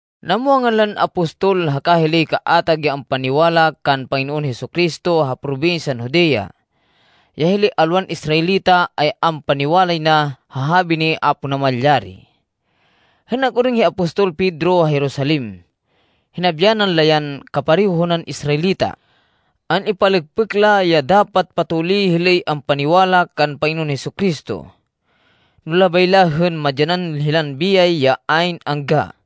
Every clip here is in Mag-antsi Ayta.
Namwangan lan apostol haka hilay kaatag ya ampaniwala kan Panginoon Jesu-Cristo ha probinsyan Judea, ya hilay alwan Israelita, ay ampaniwalay na ha habi ni Apo Namalyari. Hên nag-orong hi apostol Pedro ha Jerusalem, hinabyanan la yan kapareho nan Israelita. An-ipalêkpêk la ya dapat patuli hilay ampaniwala kan Panginoon Jesu-Cristo, no labay la hên madyanan hilan biyay ya ayn angga.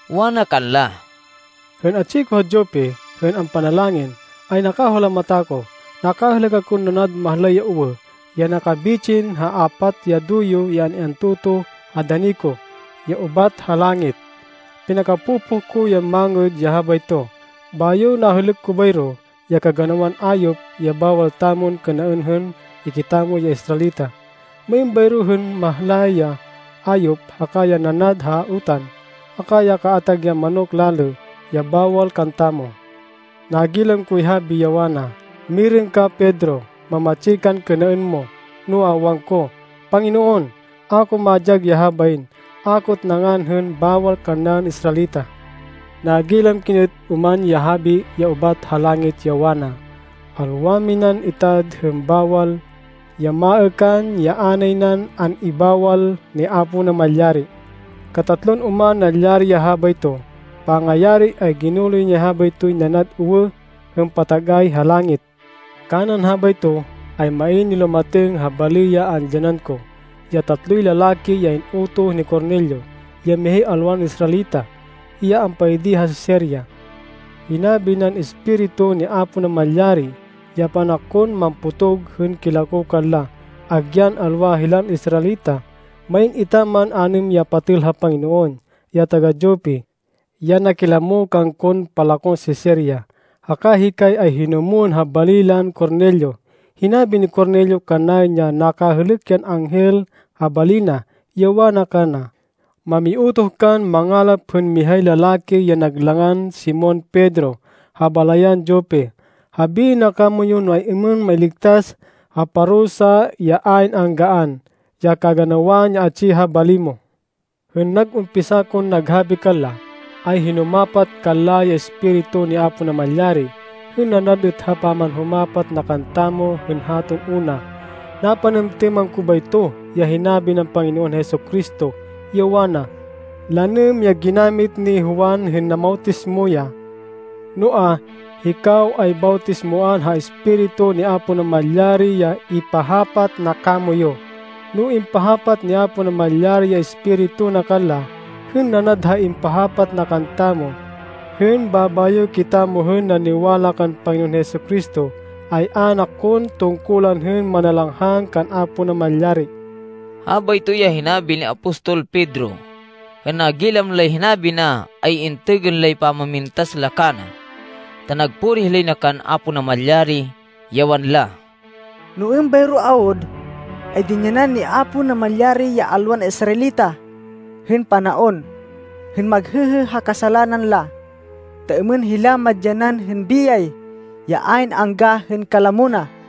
Wana kanla, “Hên atsi ko ha Jope hên ampanalangin, ay nakahalumata ko. Nakahêlêk akon nanad mahlay ya uwêh ya nakabitsin ha apat ya duyo ya an-i-antotoh ha dani ko, ya ubat ha langit. Pinakapopoh ko yan mangêd ya habayto bayo nahêlêk ko bayro ya kaganawan ayop ya bawal tamon kênaên hên hikitamoy Israelita. Main bayro hên mahlay ya ayop haka ya nanad ha utan haka ya kaatag ya manok lalê ya bawal kantamo. Nagilam koy habi, ya wana, ‘Mirêng ka, Pedro. Mamatsi kan kênaên mo!’ Noa, wangko, ‘Panginoon, a ko madyag ya habain. A ko êt nangan hên bawal kannaên Israelita.’ Nagilam kina êt oman ya habi ya ubat ha langit, ya wana, ‘Alwa minan itad hên bawal, ya maêkan ya a nay nan an-ibawal ni Apo Namalyari.’ Katatlon oman nalyari ya habayto. Pangayari, ay ginuloy ya habaytoy nanad uwêh hên patag-ay ha langit. “Kanan habayto, ay main nilumatêng ha bali ya andyanan ko, ya tatloy lalaki ya in-utoh ni Cornelio, ya mihay alwan Israelita, ya ampaidi ha Cesarea. Hinabi nan Espiritu ni Apo Namalyari ya paan akon mampotog hên kilako kanla, agyan alwa hilan Israelita. Main etaman anêm ya patêl ha Panginoon ya taga-Jope, ya nakilamo kangkon palakon Cesarea, haka hikay ay hinumwên ha bali lan Cornelio. Hinabi ni Cornelio kannaên ya nakahêlêk yan anghel ha bali na, ya wana kana, ‘Mamiutoh kan mangalap hên mihay lalaki ya nag langan Simon Pedro ha balayan Jope. Habiên na kamoyu no ay-êmên mailigtas ha parusa ya ayn anggaan ya kaganawan ya atsi ha bali mo.’ “Hên nag-umpisa kon naghabi kanla, ay hinumapat kanla ya Espiritu ni Apo Namalyari, hên nanad êt ha panhumapat na kantamo hên haton una. Napanêmtêman ko bayto ya hinabi ni Panginoon Jesu-Cristo, ya wana, ‘Lanêm ya ginamit ni Juan hên namawtismo ya. Noa, hikaw ay bawtismoan ha Espiritu ni Apo Namalyari ya ipahapat na kamoyu.’ No impahapat ni Apo Namalyari ya Espiritu na kanla, hên nanad ha impahapat na kantamo, hên babayo kitamo hên naniwala kan Panginoon Jesu-Cristo, ay ayn akon tungkulan hên manalanghang kan Apo Namalyari!” Habayto ya hinabi ni apostol Pedro. Hên nagilam lay hinabi na, ay intêgên lay pamamintas la kana, ta nagpuri hilay na kan Apo Namalyari, ya wanla, “No êmbayro awud, ay dinyanan ni Apo Namalyari ya alwan Israelita, hên panaon, hên maghêhê ha kasalanan la, ta êmên hila madyanan hên biyay ya ayn angga hên kalamo na.”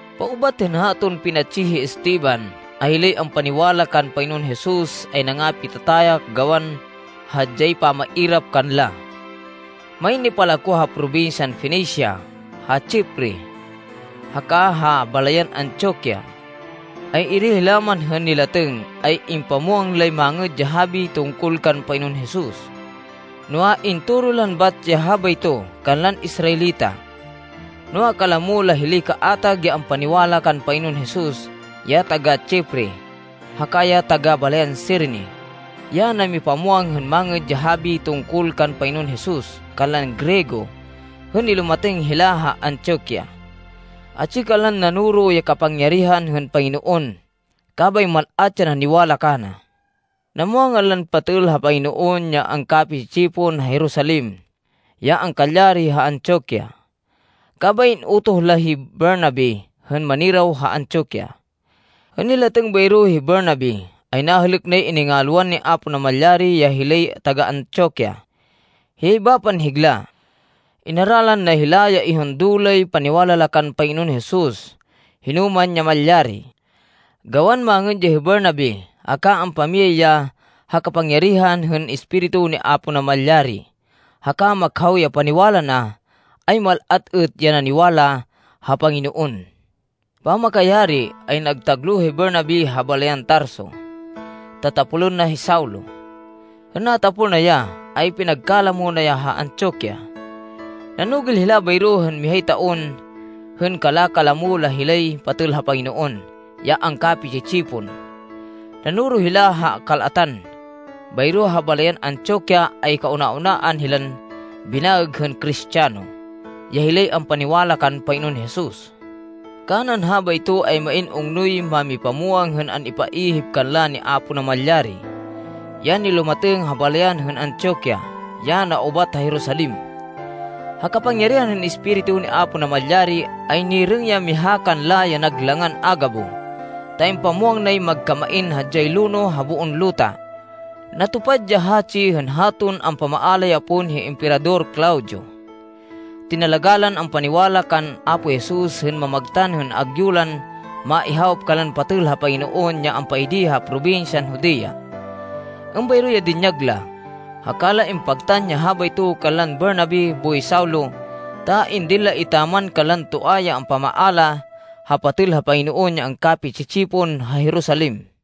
Paubat hên haton pinatsi hi Esteban, ay hilay ampaniwala kan Panginoon Jesus ay nanga-pitatayak gawan ha hadyay pamairap kanla. Main nipalako ha probinsyan Fenicia, ha Chipre, haka ha balayan Antioquia. Ay-iri hila man hên nilatêng, ay impamwang lay Mangêd ya Habi tungkol kan Panginoon Jesus. Noa, intoro lan bat ya habayto, kanlan Israelita. Noa, kalamo la hilay kaatag ya ampaniwala kan Panginoon Jesus, ya taga-Chipre haka ya taga-balayan Cirene, ya namipamwang hên Mangêd ya Habi tungkol kan Panginoon Jesus kanlan Griego hên nilumatêng hila ha Antioquia. Atsi kanlan nanoro ya kapangyarihan hên Panginoon, kabay mal-at ya naniwala kana. Namwangan lan patêl ha Panginoon ya angkapi-tsi-tsipon ha Jerusalem, ya angkalyari ha Antioquia. Kabay in-utoh la hi Bernabe hên maniraw ha Antioquia. Hên nilatêng bayro hi Bernabe, ay nahêlêk nay iningalwan ni Apo Namalyari ya hilay taga-Antioquia. Hiyay bapan higla. Inaralan na hila ya ihundo lay paniwala la kan Panginoon Jesus hinoman ya malyari. Gawan mangêd ya hi Bernabe, haka ampamiyay ya ha kapangyarihan hên Espiritu ni Apo Namalyari, haka makhaw ya paniwala na, ay mal-at êt ya naniwala ha Panginoon. Pamakayari, ay nagtagloh hi Bernabe ha balayan Tarso, ta tapolên na hi Saulo. Hên natapol na ya, ay pinagkalamo na ya ha Antioquia. Nanugêl hila bayro hên mihay taon hên kala-kalamo la hilay patêl ha Panginoon ya angkapi-tsi-tsipon. Nanoro hila ha kal-atan. Bayro ha balayan Antioquia, ay kauna-unaan hilan binaêg hên Cristiano, ya hilay ampaniwala kan Panginoon Jesus. Kanan habayto, ay main ungnoy mámipamwang hên an-ipaihip kanla ni Apo Namalyari, ya nilumatêng ha balayan hên Antioquia ya naubat ha Jerusalem. Ha kapangyarihan hên Espiritu ni Apo Namalyari ay nirêng ya miha kanla ya nag langan Agabo, ta impamwang nay magkamain hadyay lonoh ha boon luta. (Natupad ya hatsi hên haton ampamaala ya pon hi Emperador Claudio.) Tinalagá lan ampaniwala kan Apo Jesus hên mamagtan hên agyu lan maihawop kanlan patêl ha Panginoon ya ampaidi ha probinsyan Judea. Êmbayro ya dinyag la, haka la impagtan ya habayto kanlan Bernabe boy Saulo ta indin la etaman kanlan toa ya ampamaala ha patêl ha Panginoon ya angkapi-tsi-tsipon ha Jerusalem.